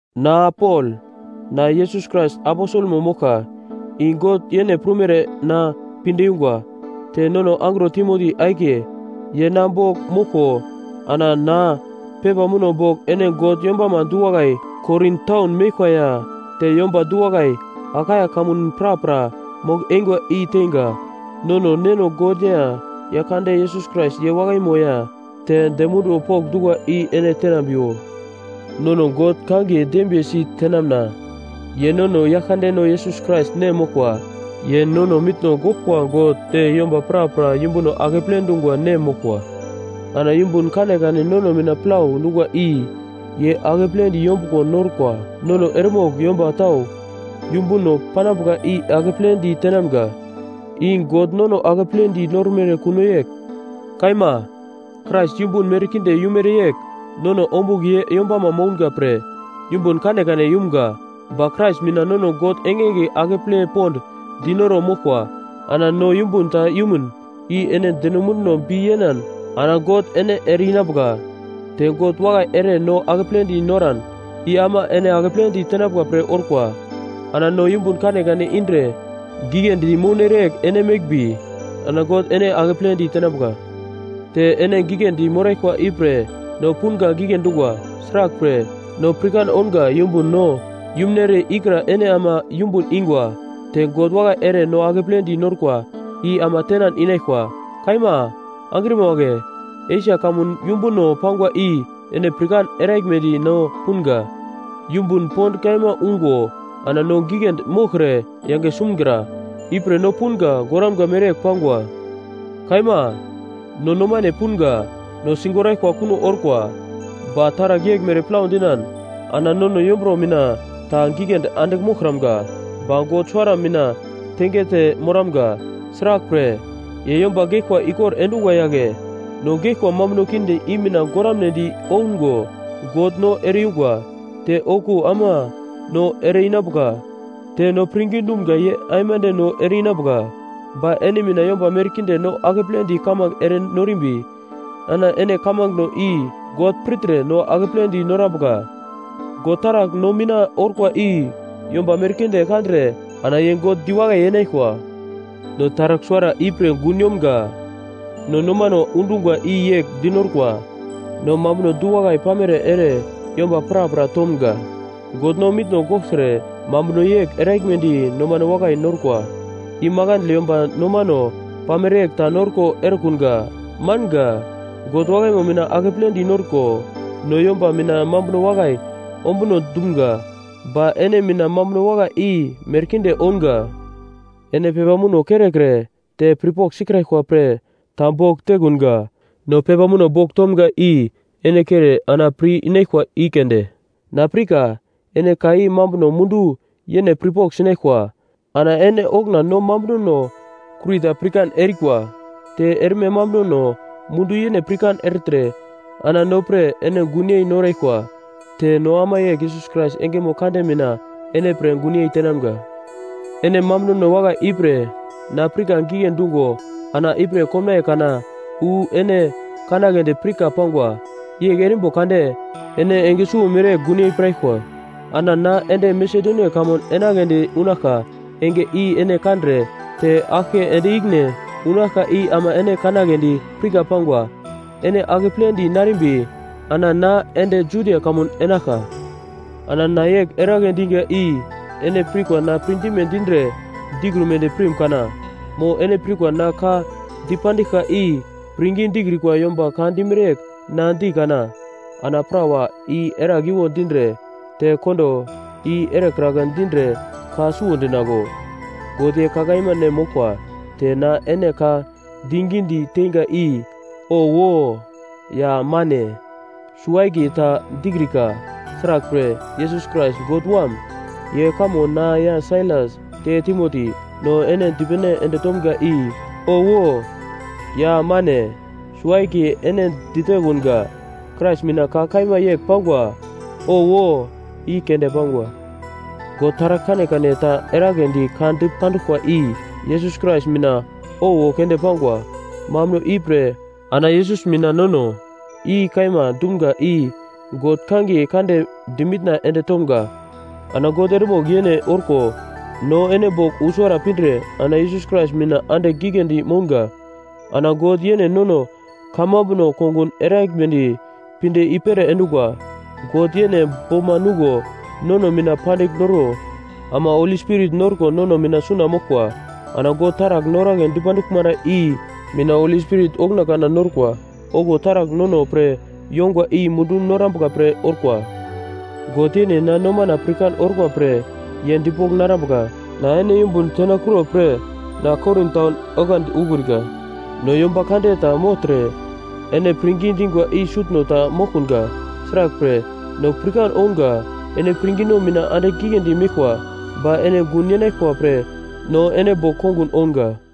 Na Pol, na Yesus Krais aposelmo moglka, i God yene prumere na pinde yungwa, te nono angro Timoti akiye, ye na bogl moglko ana na pepa muno bogl ene God yombama du-wakai Korin taun meglkwa ya te yomba du-wakai Akaia kamun prapra mogl-eingwa i teinga. Nono Neno God ya Yaglkande Yesus Krais ye wakaino ya te dem munduwo pokndungwa i ene tenambriwo. Nono God kangiye dembiye sitenamna, ye nono Yaglkandeno Yesus Krais nem moglkwa, ye nono mitno goglkwa God te yomba prapra yumbuno akeple dungwa nem moglkwa. Ana yumbun kanekane nono mina plau dungwa i ye akepledi yombuglo norkwa, nono eremogl yomba tau yumbuno panambuka i akepledi tenamga, i God nono akepledi normere kuno yegl. Kaima, Krais yumbun merkinde yumere yegl nono ombugl ye yombama mounga pre yumbun kanekane yumga. Ba Krais mina nono God engenge akeple pond dinoro moglkwa. Ana no yumbun ta yumun i ene deno munduno bi yenan ana God ene ere-inambuka. Te God wakai ere no akepledi noran, i ama ene akepledi tenambuka pre orkwa. Ana no yumbun kanekane indre giglendi mounere yegl ene meglmbi, ana God ene akepledi tenambuka. Te ene giglendi moraglkwa, ipre, no punga gigle dungwa. Sraglpre, no pirkan ounga yumbun no yumnere ikra ene ama yumbun ingwa. Te God wakai ere no akepledi norkwa, i ama tenan inaglkwa. Kaima, angrima wagle, Esia kamun yumbuno pangwa i ene pirkan eraglmedi no punga. Yumbun pond kaima ungo ana no giglendi moglkre yange sumgra. Ipre no punga goramga mereyegl pangwa. Kaima, no nomane punga no sigoraglkwa kuno orkwa. Ba taragl yeglmere plau dinan ana nono yombro mina ta giglendi andigl moglkramga, ba God suwara mina tengete moramga, sraglpre, ye yomba geglkwa ikor endungwa yagle. No geglkwa mambuno kinde i mina goramnedi oungo God no ere-yungwa, te okuwo ama no ere-inambuka, te no pirngi dumga ye aimande no ere-inambuka. Ba ene mina yomba merkinde no akepledi kamange ere norimbi, ana ene kamangeno i God pirtre no akepledi norambuka. God taragl no mina orkwa i yomba merkinde kandre ana ye God diwakai yenaglkwa. No taragl suwara ipre gun yomga: No nomano undungwa i yegl di norkwa. No mambuno du-wakai pamere ere yomba prapra tomga. God no mitno gogltre mambuno yegl eraglmedi nomano wakai norkwa. I makandle yomba nomano pamere yegl ta norko erekunga. Manga. God wakaimo mina akepledi norko no yomba mina mambuno wakai ombuno dumga, ba ene mina mambuno wakai i merkinde ounga. Ene pepa muno kerekre te pirpogl sikraglkwa pre ta bogl tekunga. No pepa muno bogl tomga i ene kere ana pir inaglkwa i keunde. Na pirka ene ka i mambuno mundu yene pirpogl sinaglkwa. Ana ene okuna no mambunono kurita pirkan erikwa. Te erme mambunono mundu yene pirkan ertre ana no pre ene gunyei noraglkwa. Te no ama yegl Yesus Krais engemo kande mina ene pre gunyei tenamga. Ene mambunono wakai ipre na pirka gigle dungo ana ipre komnaiye kana wu ene kanagledi pirka pangwa. Yegl erimbo kade ene enge suwo mereyegl gunyei piraglkwa. Ana na ende Masedonia kamun enagledi unaglka enge i ene kandre te aglke ende ikine unaglka i ama ene kanagledi pirka pangwa. Ene akepledi narimbi ana na ende Judia kamun enaglka. Ana na yegl eragle diga i ene pirkwa na pirdime dindre dikrumedi pirim kana? Mo ene pirkwa na ka dipandiglka i pirngi dikrikwa yomba ka dimere yegl na di kana? Ana “Prawa i eragliwo dindre te kondo i erekragla dindre ka suwo dinaglo?” God ye ka kaima nem moglkwa, te na ene ka digidi teinga i “Owo” ya “Mane” suwo-akiye ta dikrika. Sraglpre, Yesus Krais, God Wam, ye kamo na ya Sailas te Timoti, no ene dipene ende tomga i “Owo” ya “Mane” suwo-akiye ene ditekunga. Krais mina ka kaima yegl pangwa, “Owo” i keunde pangwa. God taragl kanekane ta eragledi ka dipanduglkwa i Yesus Krais mina “Owo” keunde pangwa. Mambuno ipre ana Yesus mina nono “I kaima” dumga i God kangiye kande dimitna ende tomga. Ana God eremogl yene orko no ene bogl usuwara pindre ana Yesus Krais mina andigl giglendi mounga. Ana God yene nono kamambuno kongun eraglmedi pinde i-pere endungwa. God yene boma nuglo nono mina pandigl noro ama Holi Spirit norko nono mina suna moglkwa. Ana God taragl noragle dipanduglmara i mina Holi Spirit okuna kana norkwa okuwo taragl nono pre yongwa i mundu norambuka pre orkwa. God yene na nomana pirkan orkwa pre ye dipogl narambuka. Na ene yumbun tenakuro pre na Korin taun oglandi ukrika. No yomba kande ta mogltre ene pirngi dingwa i sutno ta moglkunga. Sraglpre, no pirkan ounga ene pirngino mina andigl giglendi meglkwa. Ba ene gun yenaglkwa pre no ene bogl kongun ounga.